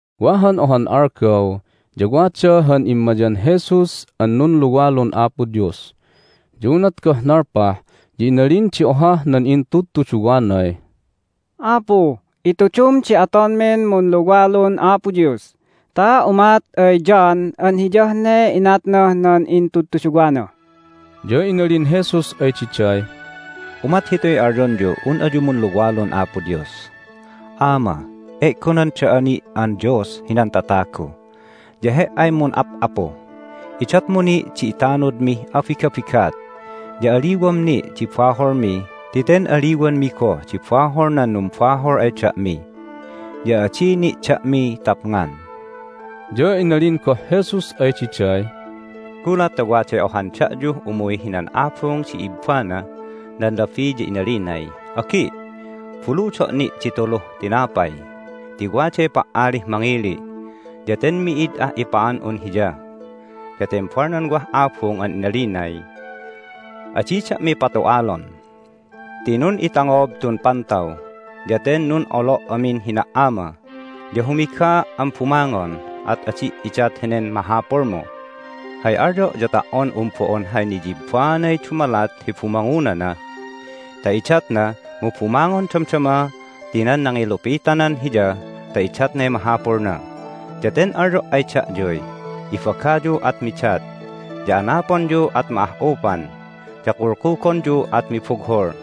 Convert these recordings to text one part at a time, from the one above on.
Wa han ohan algaw ya wada han immayan Jesus an nunluwalun Apo Dios. Ya unat goh nalpah ya inalin di ohah nan intudtuduwanay, "Apu, itudum di atonmin munluwalun Apo Dios ta umat ay John an hiyah ne inatnah nan intudtuduwana." Ya inalin Jesus ay diday, "Umat hituy alyonyuh un ayu munluwalun Apo Dios: Ama, E'gonan da'a ni' an Dios hinan tatagu, ya He"ay mun'ap'apu. Idatmu ni' di itanudmih abigabigat, ya aliwam ni' di baholmi ti ten aliwanmi goh di bahol nan numbahol ay da'mi. Ya adi ni' da'mi tapngan." Ya inalin goh Jesus ay diday, "Gulat ta waday ohan da'yuh umuy hinan abung di ibbanah nan labi ya inalinay, Agi', buludo' ni' di tuluh tinapay ti waday pa"alih mangili', ya ten mi'id ah ipa'an'un hiya! Ya tembal nan wah abung an inalinay, Adi da'mi patu'alon! Ti nun'itangob tun pantaw, ya ten nun'olo' amin hina"ama, ya humigaa' an bumangon, at adi' idat henen mahapulmu! Hay alyo' ya ta"on un bo'on hay niyibaanay dumalat hi bumangunana ta idatna mu bumangon damdama ti nan nangilupitanan hiya ta idatnay mahapulna. Ya ten alyo' ay da'yuy, Ibagayu at midat, ya anaponyu at ma'ah'upan, ya kulkugonyu at mibughul.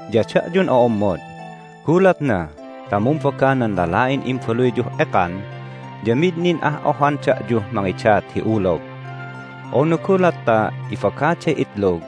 Ya da'yun o'ommod, gulatna ta mumbaga nan lala'in imbaluyyuh ekan ya mid nin ah ohan da'yuh mangidat hi ulog. Unu gulat ta ibagaday itlog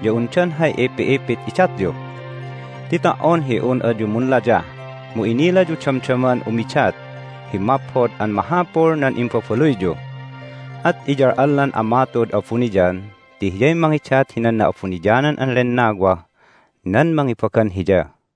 ya undan hay ipi'ipit idatyu? Ti ta"on hi un ayu munlayah mu inilayu damdaman umidat hi maphod an mahapul nan imbabaluyyu. At iyal'allan Ama tu'ud abuniyan ti Hiyay mangidat hinan Na'abuniyanan an Lennawah nan mangibagan Hiya!"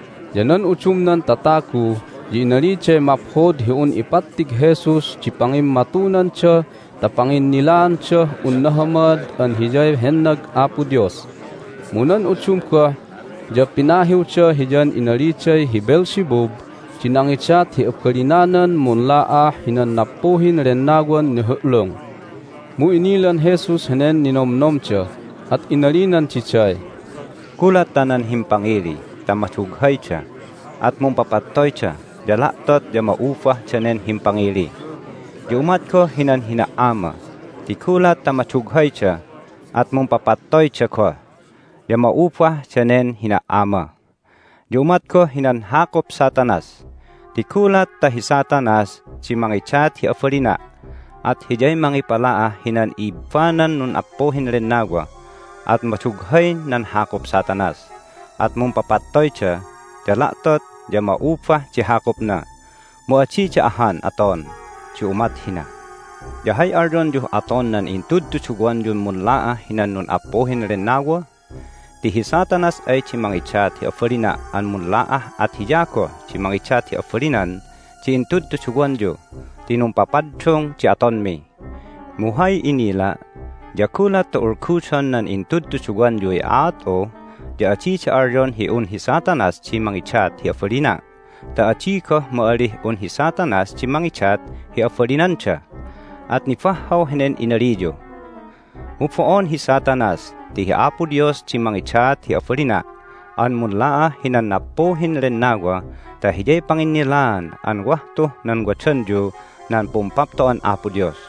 Ya nan udumnan tatagu ya inaliday maphod hi un ipattig Jesus di pangimmatunanda ta panginnilaandah un nahamad an Hiyay hennag Apo Dios. Mu nan udum goh ya pinahiwda Hiyan inaliday hi Beelzebub di nangidat hi abalinanan munla'ah hinan nappuhin lennawan nihu'lung. Mu inilan Jesus henen ninomnomda, at inalinan diday, "Gulat ta nan himpangili ta madughayda, at mumpapattoyda, ya la'tot ya ma'ubah danen himpangili. Ya umat goh hinan hina"ama, ti gulat ta madughayda at mumpapattoyda goh, ya ma'ubah danen hina"ama. Ya umat goh hinan hakup Satanas, ti gulat ta hi Satanas di mangidat hi abalina' at hiyay mangipala'ah hinan ibbanan nappuhin lennawa, at madughay nan hakup Satanas, at mumpapattoyda, ya la'tot ya ma'ubah di hakupna. Mu adida ahan aton di umat hina. Ya hay alyonyuh aton nan intudtuduwanyun munla'ah hinan nun'appuhin lennawa? Ti hi Satanas ay di mangidat hi abalina' an munla'ah at hiya goh di mangidat hi abalinan di intudtuduwanyu ti numpapaddung di atonmi. Mu hay inila' ya gulat ta ulgudon nan intudtuduwanyuy aat'u ya adida alyon hi un hi Satanas di mangidat hi abalina' ta adi goh ma'alih un hi Satanas di mangidat hi abalinanda. At nibahhaw henen inaliyu. Mu bo'on hi Satanas, ti hi Apo Dios di mangidat hi abalina' an munla'ah hinan nappuhin lennawa ta hiyay panginnilaan an wah tuh nan wadanyu nan Pumpapto'an Apo Dios.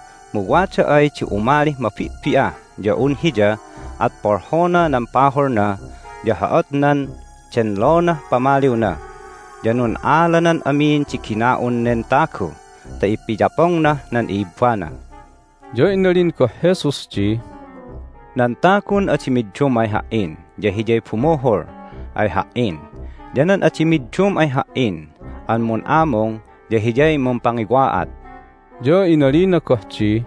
Mu wada ay di umalih mabi'bi'ah ya un hiya at polhona nan pahulna ya ho'otnan denlonah pamaliwna, ya nun'alanan amin di gina'un nen tagu ta ipiyapongnah nan i'ibbana." Ya inalin goh Jesus di, "Nan tagun adi middum ay Ha"in ya hiyay bumuhul ay Ha"in, ya nan adi middum ay Ha"in an mun'amung ya hiyay mumpangiwa'at." Ya inalina goh di,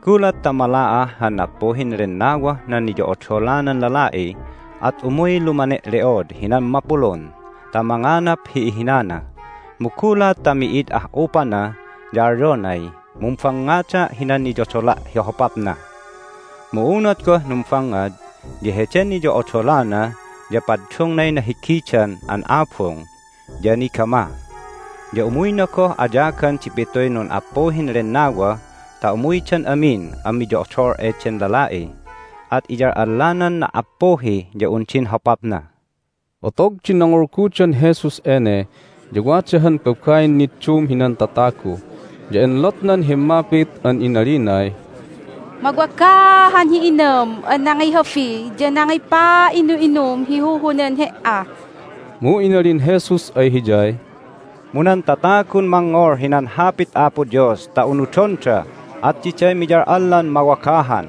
"Gulat ta mala'ah han nappuhin lennawah nan niyo'odolanan lala'i at umuy lumane'le'od hinan mapulun ta manganap hi ihinana. Mu gulat ta mi'id ah'upana ya alyonay, Mumbangngada' hinan niyodola' hi hopapna. Mu unat goh numbangngad ya heden niyo'odolana ya paddungnay nahigidan an abung, ya nigamah. Ya umuyna goh ayagan di pituy nun'appuhin lennawa ta umuydan amin an miyo'odol eden lala'i. At iyal'allanan na"appuhi ya un din hopapna." Otog di nangulgudan Jesus ene ya wada han babain niddum hinan tatagu, ya enlotnan himmapit an inalinay, "Mawagahan hi inam an nangihabi ya nangipa'inu'inum hi huhunan He"a!" Mu inalin Jesus ay hiyay, "Mu nan tatagun mangngol hinan Hapit Apo Dios ta unudonda at diday miyal'allan mawagahan."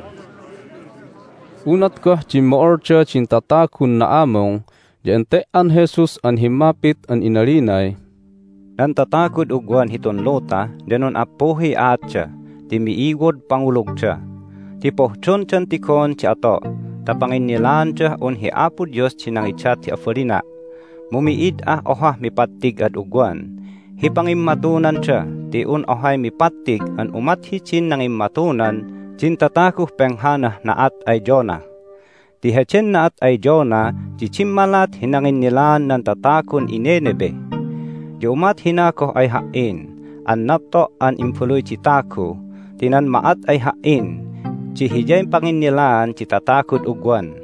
Unat goh dimmo'olda din tatagun na'amung ya ente"an Jesus an himmapit an inalinay, "Nan tatagud ugwan hitun luta ya nun'appuhiy aatda ti mi'iwod pangulugda! Ti pohdondan tigon di ato' ta panginnilaandah un hi Apo Dios di nangidat hi abalina', mu mi'id ah ohah mipattig ad ugwan hi pangimmatunanda ti un ohay mipattig an umat hidin nangimmatunan din tataguh penghanah na'at ay Jonah. Ti heden na'at ay Jonah di dimmalat hi nanginnilaan nan tatagun iNineveh. Ya umat hina goh ay Ha"in an napto' an Imbaluy di Tagu ti nan ma'at ay Ha"in di hiyay panginnilaan di tatagud ugwan.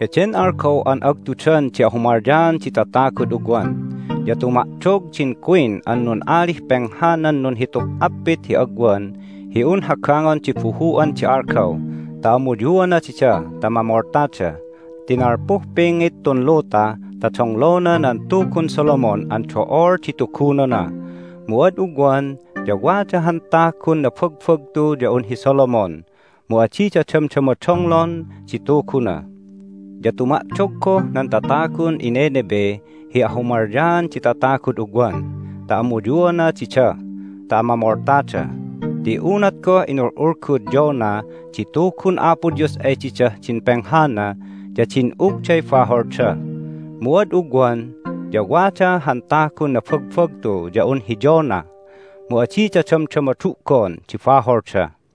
Heden algaw an agtudan di ahumalyaan di tatagud ugwan ya tuma'dog din queen an nun'alih penghanan nunhituh appit hi agwan hi un hagangon di buhu'an di algaw ta amuyuana dida ta mamoltada, ti nalpuh pingit tun luta ta donglona nan tugun Solomon an do'ol di tugunona, mu ad ugwan ya wada han tagun nabagbagtu ya un hi Solomon, mu adida damdama donglon di Tuguna. Ya tuma'dog goh nan tatagun iNineveh hi ahumalyaan di tatagud ugwan ta amuyuana dida ta mamoltada. Ti unat goh inul'ulgud Jonah di Tugun Apo Dios ay didah din penghana ya din'ugday baholda. Mu ad ugwan ya wada han tagun nabagbagtu ya un hi Jonah, mu adida damdama du'gon di baholda!"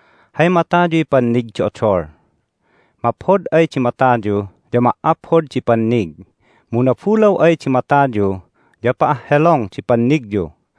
Hay matayuy pannig di odol. Maphod ay di matayu ya ma"aphod di pannig, mu nabulaw ay di matayu ya pa'ahhelong di pannigyu.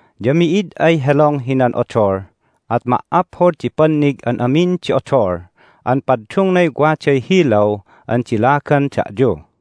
Ya mi'id ay helong hinan odol at ma"aphod di pannig an amin di odol an paddungnay waday hilaw an dilagan da'yu."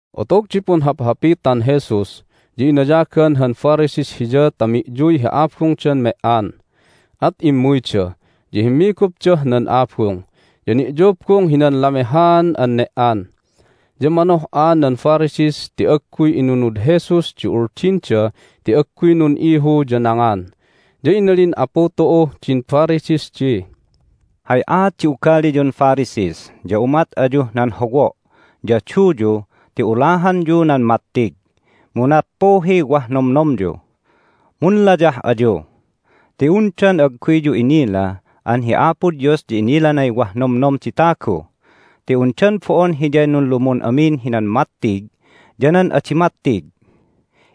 Otog di punhaphapitan Jesus ya inayagan han Pharisees Hiya ta mi'yuy hi abungdan me"an. At immuyda, ya himmigupdah nan abung, ya ni'yubung hinan lamehaan an ne"an. Ya manoh'a nan Pharisees ti agguy inunud Jesus di uldinda ti agguy nun'ihu ya nangan. Ya inalin Apu tu'uh din Pharisees di, "Hay aat di ugaliyun Pharisees ya umat ayuh nan howo' ya duyu ti ulahanyu nan mattig, mu nappuhiy wah nomnomyu. Munlayah ayu! Ti undan agguyyu inila an hi Apo Dios ya inilanay wah nomnom di tagu. Ti undan bo'on Hiyay nunlumun amin hinan mattig ya nan adi mattig?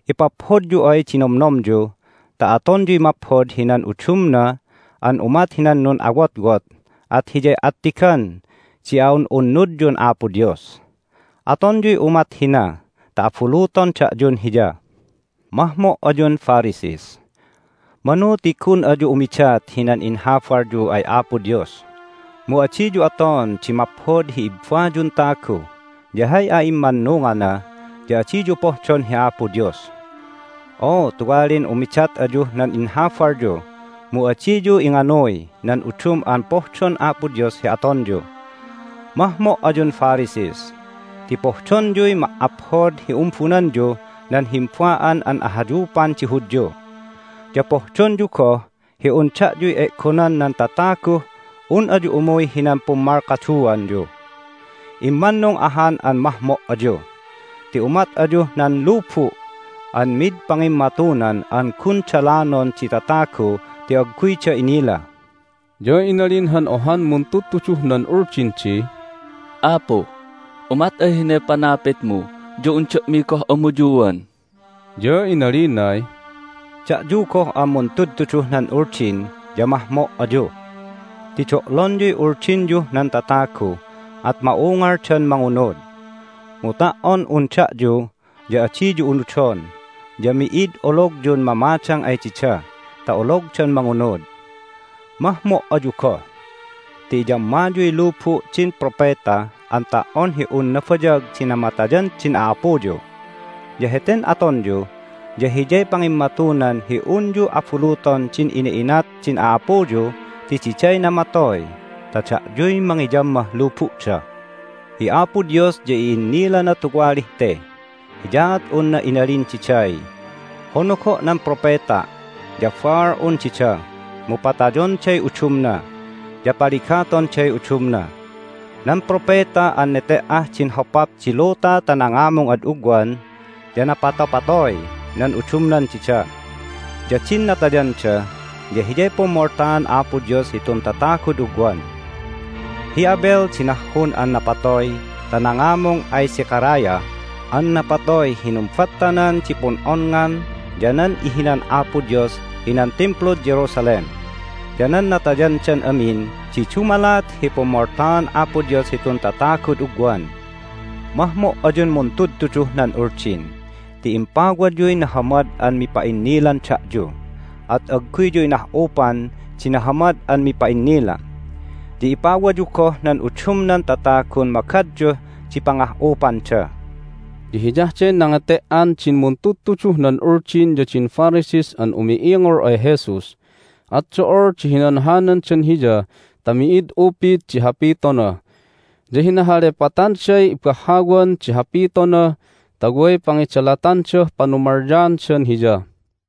Ipaphodyu ay di nomnomyu ta atonyuy maphod hinan udumna an umat hinan nun'awotwot at hiyay attigan di a'un'unnudyun Apo Dios. Atonyuy umat hina ta abuluton da'yun Hiya. Mahmo' ayun Pharisees! Manu ti gun ayu umidat hinan inhabalyu ay Apo Dios, mu adiyu aton di maphod hi ibbayun tagu ya hay a'immannungana ya adiyu pohdon hi Apo Dios. O tuwalin umidat ayuh nan inhabalyu, mu adiyu inganuy nan udum an pohdon Apo Dios hi atonyu! Mahmo' ayun Pharisees! Ti pohdonyuy ma"aphod hi umbunanyuh nan himba'an an ahayupan di Hudyu, ya pohdonyu goh hi un da'yuy e'gonan nan tataguh un ayu umuy hinan pummalkaduanyu. Immannung ahan an mahmo' ayu! Ti umat ayuh nan lubu' an mid pangimmatunan an gun dalanon di tatagu ti agguyda inila." Ya inalin han ohan muntudtuduh nan Uldin di, "Apu, umat ay hinay panapitmu ya un da'mi goh amuyuan!" Ya inalinay, "Da'yu goh an muntudtuduh nan Uldin ya mahmo' ayu! Ti do'lonyuy uldinyuh nan tatagu, at ma'ungaldan mangunud. Mu ta"on un da'yu ya adiyu unudon, ya mi'id ologyun mamadang ay dida ta ologdan mangunud! Mahmo' ayu goh! Ti iyammayuy lubu' din propeta an ta"on hi un nabayag di namatayan din a'apuyu. Ya heten atonyu ya hiyay pangimmatunan hi unyu abuluton din ina'inat din a'apuyu ti diday namatoy ta da'yuy mangiyammah lubu'da! Hi Apo Dios ya i'innilana tuwalih te, hiyaat unna inalin diday, Honogo' nan propeta' ya baal'un dida, mu patayonday udumna, ya paligatonday udumna. Nan propeta an nete"ah din hopap di luta ta nangamung ad ugwan ya napatopatoy nan udumnan dida. Ya din natayanda ya hiyay pummoltaan Apo Dios hitun tatagud ugwan. Hi Abel di nahhun an napatoy ta nangamung ay Zechariah an napatoy hi numbattanan di pun'onngan ya nan ihinan Apo Dios hinan Timplud Jerusalem. Ya nan natayandan amin di dumalat hi pummoltaan Apo Dios hitun tatagud ugwan. Mahmo' ayun muntudtuduh nan Uldin! Ti impawayuy nahamad an mipa'innilan da'yu, at agguyyu inah'upan di nahamad an mipa'innila. Ya ipawayu goh nan udumnan tatagun magadyuh di pangah'upanda." Ya hiyah de nangete"an din muntudtuduh nan Uldin ya din Pharisees an umi'ingol ay Jesus, at do'ol di hinanhanandan Hiya ta mi'id upid di hapitona. Ya hinahalepatanday ibahhawan di hapitona ta way pangidalatandah panumalyadan Hiya.